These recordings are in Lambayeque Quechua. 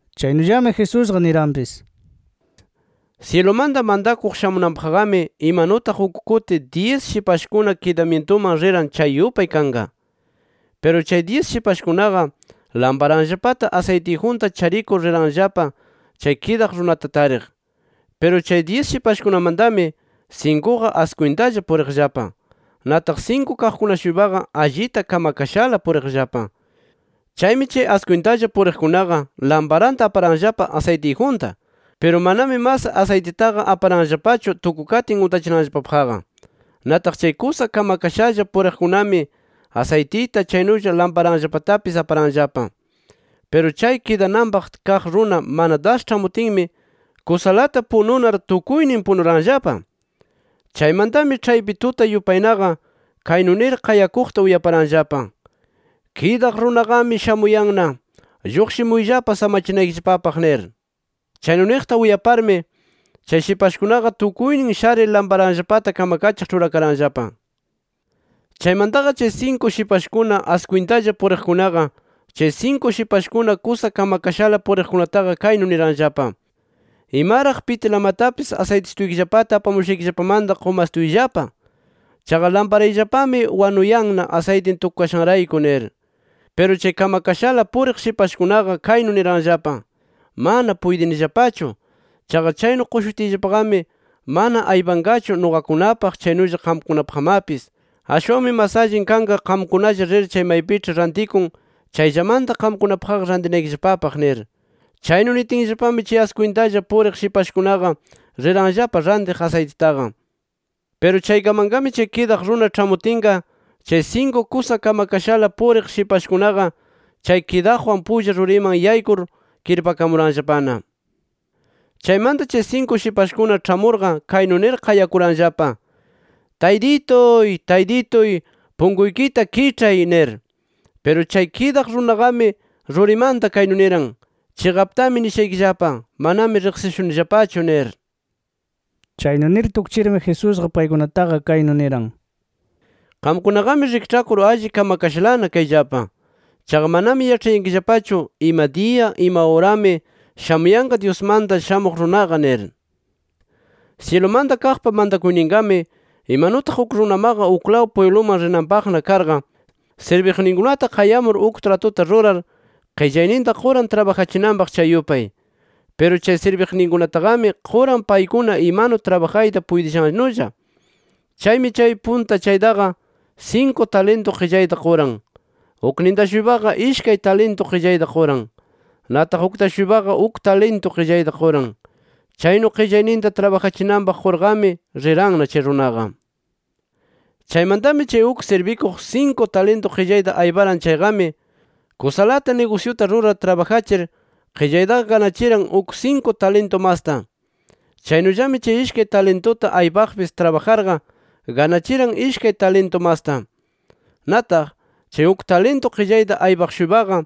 Chaynullami Jesusqa niranpis: “Syilumanta mantakuq shamunanpaqqami imanutaq uk kuti dyis shipashkuna kidamyintuman riran chay yupay kanqa. Piru chay dyis shipashkunaqa lamparanllapata asaytiyjunta charikur riranllapa chay kidaq runata tariq. Piru chay dyis shipashkunamantami sinkuqa askwintalla puriqllapa. Nataq sinku kaqkuna-shuypaqa allita kamakashala puriqllapa. Chaymi chay askwintalla puriqkunaqa lamparanta aparanllapa asaytiyjunta. Piru manami mas asaytitaqa aparanllapachu tukukatin untachinanllapapaqqa. Nataq chay kusa kamakashalla puriqkunami asaytita chaynulla lamparanllapatapis aparanllapa. Piru chay kidananpaq kaq runa mana das ĉhamutinmi, kusalata pununar tukuynin punuranllapa. “Chaymantami ĉhaypi tuta yupaynaqa kaynu nir qayakuqta uyaparanllapa: ‘¡Kidaq runaqami shamuyanna! ¡Lluqshimuyllapa samachinaykillapapaq!’ nir. Chaynu niqta uyaparmi, chay shipashkunaqa tukuynin sharir lamparanllapata kamakachiq ĉhurakaranllapa. Chaymantaqa chay sinku shipashkuna askwintalla puriqkunaqa chay sinku shipashkuna kusa kamakashala puriqkunataqa kaynu niranllapa: ‘Imaraq pitilamatapis asaytisituykillapata apamushaykillapamanta qumastuyllapa. Chaqa lamparayllapami wanuyanna asaytin tukukayashanrayku’ nir. Piru chay kamakashala puriq shipashkunaqa kaynu niranllapa: ‘¡Mana puytinillapachu! Chaqa chaynu qushutiyllapaqami, mana aypanqachu nuqakunapaq chaynulla qamkunapaqmapis. Ashwanmi mas allin kanqa qamkunalla rir chay maypiĉhi rantikun chayllamanta qamkunapaqqa rantinaykillapapaq’ nir. Chaynu nitinllapami chay askwintalla puriq shipashkunaqa riranllapa rantiq asaytitaqa. Piru chaykamanqami chay kidaq runa ĉhamutinqa, chay sinku kusa kamakashala puriq shipashkunaqa chay kidaqwan pulla ruriman yaykur kirpakamuranllapana. Chaymanta chay sinku shipashkuna ĉhamurqa kaynu nir qayakuranllapa: ‘¡Taytituy, Taytituy, punkuykita kiĉhay!’ nir. Piru chay kidaq runaqami rurimanta kaynu niran: ‘Chiqaptami nishaykillapa: Manami riqsishunillapachu’ nir”. Chaynu nir tukchirmi, Jesusqa paykunataqa kaynu niran: “Qamkunaqami rikĉhakur alli kamakashalana kayllapa. Chaqa manami yaĉhayankillapachu ima diya, ima urami shamuyanqa Dyusmanta Shamuq Runaqa nir”. “Syilumanta kaqpa mantakuyninqami, imanutaq uk runamaqa uklaw pwibluman rinanpaqna karqa, sirbiqninkunata qayamur uk tratuta rurar qillayninta quran trabajachinanpaq, chay yupay. Piru chay sirbiqninkunataqami quran paykuna imanu trabajayta puytishannulla. Chaymi chay punta chaytaqa sinku talintu qillayta quran. Ukninta-shuypaqa ishkay talintu qillayta quran. Nataq ukta-shuypaqa uk talintu qillayta quran. Chaynu qillayninta trabajachinanpaq qurqami riranna chay runaqa. “Chaymantami, chay uk sirbikuq sinku talintu qillayta ayparan chayqami, kusalata nigusyuta rurar trabajachir qillaytaqa ganachiran uk sinku talintu masta. Chaynullami, chay ishkay talintuta aypaqpis trabajarqa ganachiran ishkay talintu masta. Nataq, chay uk talintu qillayta aypaq-shuypaqa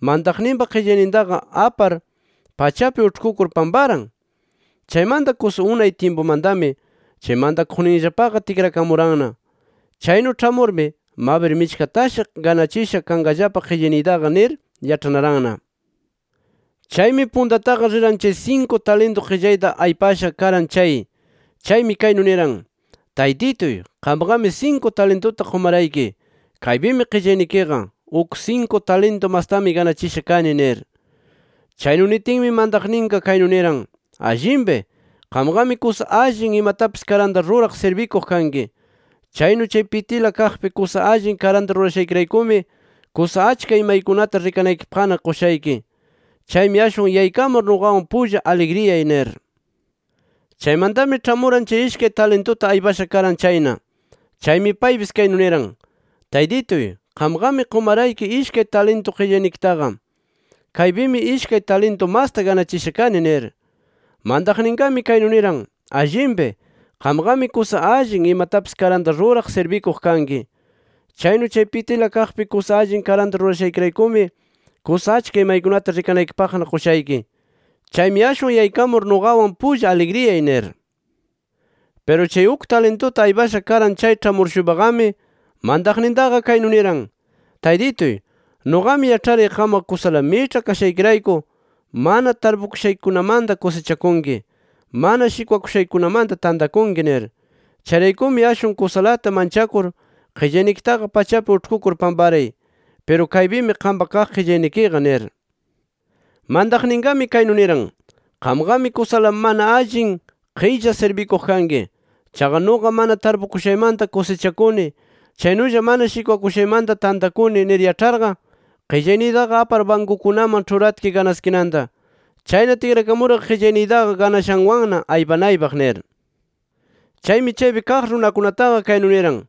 mantaqninpa qillaynintaqa apar pachapi uĉhkukur pamparan. “Chaymanta kusa unay tyimpumantami chay mantaqninllapaqa tikrakamuranna. Chaynu ĉhamurmi, mabir michkatashi ganachisha kanqallapa qillayniytaqa nir yaĉhanaranna. Chaymi puntataqa riran chay sinku talintu qillayta aypasha karan chay. Chaymi kaynu niran: ‘Taytituy qamqami sinku talintuta qumarayki. Kaypimi qillaynikiqa. Uk sinku talintu mastami ganachisha kani’ nir. Chaynu nitinmi, mantaqninqa kaynu niran: ‘Allinpi. Qamqami kusa allin, imatapis karanta ruraq sirbikuq kanki. Chaynu chay pitila kaqpi kusa allin karanta rurashaykiraykumi kusa achka imaykunata rikanaykipaqna qushayki. Chaymi ashwan yaykamur nuqawan pulla aligriyay’ nir. “Chaymantami ĉhamuran chay ishkay talintuta aypasha karan chayna. Chaymi paypis kaynu niran: ‘Taytituy qamqami qumarayki ishkay talintu qillaynikitaqa. Kaypimi ishkay talintu masta ganachisha kani’ nir. Mantaqninqami kaynu niran: ‘Allinpi. Qamqami kusa allin, imatapis karanta ruraq sirbikuq kanki. Chaynu chay pitila kaqpi kusa allin karanta rurashaykiraykumi kusa achka imaykunata rikanaykipaqna qushayki. Chaymi ashwan yaykamur nuqawan pulla aligriyay’ nir. “Piru chay uk talintuta aypasha karan chay ĉhamur-shuypaqami, mantaqnintaqa kaynu niran: ‘Taytituy, nuqami yaĉharay qamqa kusala miĉha kashaykirayku, mana tarpukushaykikunamanta kusichakunki, mana shikwakushaykikunamanta tantakunki nir. Chayraykumi, ashwan kusalata manchakur qillaynikitaqa pachapi uĉhkukur pamparay. Piru kaypimi qampa kaq qillaynikiqa’ nir. Mantaqninqami kaynu niran: ‘Qamqami kusala mana allin qilla sirbikuq kanki. Chaqa nuqa mana tarpukushaymanta kusichakuni, chaynulla mana shikwakushaymanta tantakuni nir yaĉharqa, qillayniytaqa apar bankukunaman ĉhuratki ganaskinanta. Chayna tikrakamurqa qillayniytaqa ganashanwanna aypanaypaq’ nir. Chaymi chaypi kaq runakunataqa, kaynu niran: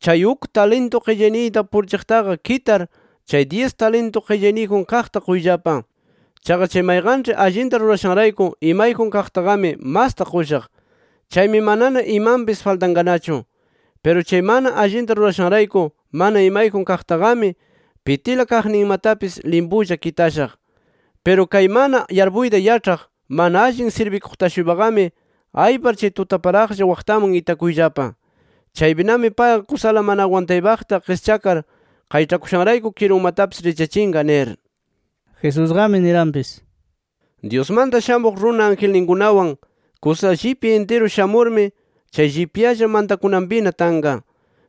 ‘Chay uk talintu qillayniyta purichiqtaqa kitar, chay dyis talintu qillayniyjun kaqta quyllapa. Chaqa chay mayqanĉhi allinta rurashanrayku, imayjun kaqtaqami masta qushaq. Chaymi manana imanpis faltanqanachu. Piru chay mana allinta rurashanrayku mana imayjun kaqtaqami, pitila kaqninmatapis limpula kitashaq. Piru kay mana yarpuyta yaĉhaq, mana allin sirbikuqta-shuypaqami, aypar chay tutaparaqlla waqtaman itakuyllapa. Chaypinami payqa kusala mana agwantaypaqta qischakar qayĉhakushanrayku kirunmatapis richyachinqa’ nir”. Jesusqami niranpis: “Dyusmanta Shamuq Runa angelninkunawan, kusa llipya intiru shamurmi, chay llipyalla mantakunanpina tanqa.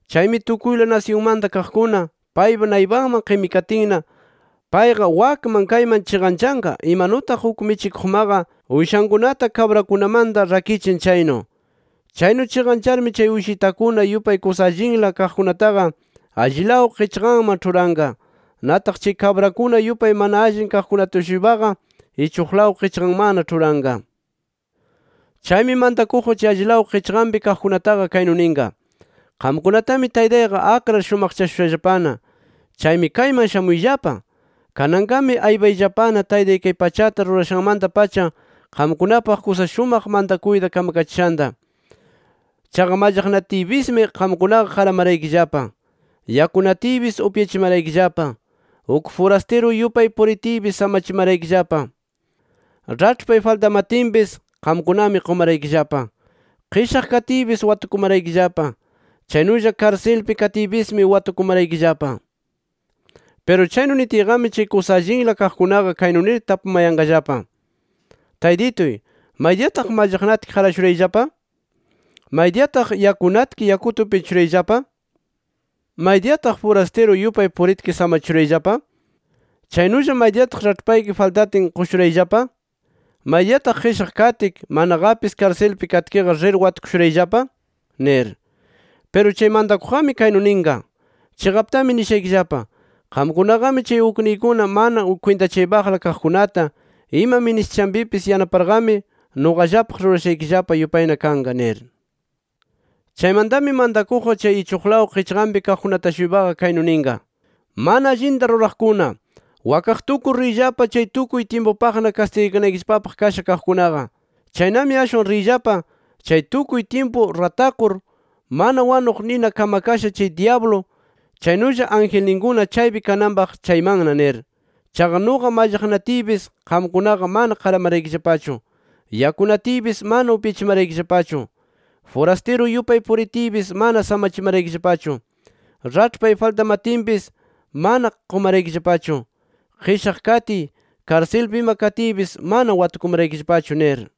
Chaymi tukuyla nasyunmanta kaqkuna, paypa naypanman qimikatinna, payqa wakman kayman chiqanchanqa, imanutaq uk michikuqmaqa uyshankunata kabrakunamanta rakichin chaynu. Chaynu chiqancharmi chay uyshitakuna yupay kusa allinla kaqkunataqa allilaw qichqanman ĉhuranqa. Nataq chay kabrakuna yupay mana allin kaqkunata-shuypaqa ichuqlaw qichqanmanna ĉhuranqa. Chaymi mantakuqqa chay allilaw qichqanpi kaqkunataqa kaynu ninqa: ‘Qamkunatami Taytayqa akrar shumaqchashushallapana. Chaymi kayman shamuyllapa. Kananqami aypayllapana Taytay kay pachata rurashanmanta-pacha qamkunapaq kusa shumaq mantakuyta kamkachishanta. Chaqa mallaqnatiypismi qamkunaqa qaramaraykillapa. Yakunatiypis upyachimaraykillapa. Uk furastiru yupay puritiypis samachimaraykillapa. Raĉhpay faltamatinpis qamkunami qumaraykillapa. Qishaq katiypis watukumaraykillapa. Chaynulla karsilpi katiypismi watukumaraykillapa’. “Piru chaynu nitiyqami chay kusa allinla kaqkunaqa kaynu nir tapumayanqallapa: ‘Taytituy ¿maydiyataq mallaqnatki qarashurayllapa? ¿Maydiyataq yakunatki, yakuta upyachishurayllapa? ¿Maydiyataq furastiru yupay puritki samachishurayllapa? ¿Chaynulla maydiyataq raĉhpayki faltatin qushurayllapa? ¿Maydiyataq qishaq katki manaqapis karsilpi katkiqa rir watukushurayllapa?’ nir. Piru chay mantakuqqami kaynu ninqa: ‘Chiqaptami nishaykillapa: Qamkunaqami chay ukniykuna mana kwintachaypaqla kaqkunata ima ministishanpipis yanaparqami, nuqallapaq rurashaykillapa yupayna kanqa’ nir. “Chaymantami mantakuqqa chay ichuqlaw qichqanpi kaqkunata-shuypaqa kaynu ninqa: ‘Mana allinta ruraqkuna, wakaq tukur riyllapa chay tukuy tyimpupaqna kastigakanaykillapapaq kasha kaqkunaqa. Chaynami ashwan riyllapa chay tukuy tyimpu ratakur mana wanuq nina kamakasha chay dyablu, chaynulla angelninkuna chaypi kananpaq chaymanna nir. Chaqa nuqa mallaqnatiypis, qamkunaqa mana qaramaraykillapachu. Yakunatiypis mana upyachimaraykillapachu. Furastiru yupay puritiypis mana samachimaraykillapachu. Raĉhpay faltamatinpis mana qumaraykillapachu. Qishaq katiy, karsilpi ima katiypis mana watukumaraykillapachu’ nir.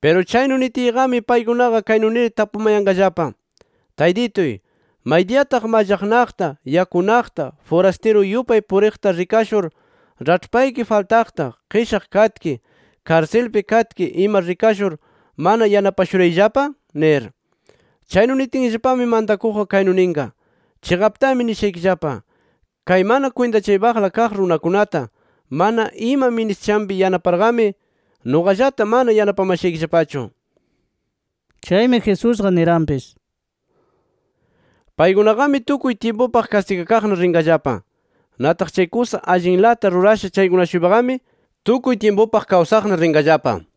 “Piru chaynu nitiyqami paykunaqa kaynu nir tapumayanqallapa: ‘Taytituy, ¿maydiyataq mallaqnaqta, yakunaqta, furastiru yupay puriqta rikashur, raĉhpayki faltaqta, qishaq katki, karsilpi katki ima rikashur, mana yanapashurayllapa?’ nir. Chaynu nitinllapami mantakuqqa kaynu ninqa: ‘Chiqaptami nishaykillapa: Kay mana kwintachaypaqla kaq runakunata mana ima ministishanpi yanaparqami, nuqallata mana yanapamashaykillapachu’”. Chaymi Jesusqa niranpis: “Paykunaqami tukuy tyimpupaq kastigakaqna rinqallapa. Nataq chay kusa allinlata rurasha chaykuna-shuypaqami tukuy tyimpupaq kawsaqna rinqallapa” nir.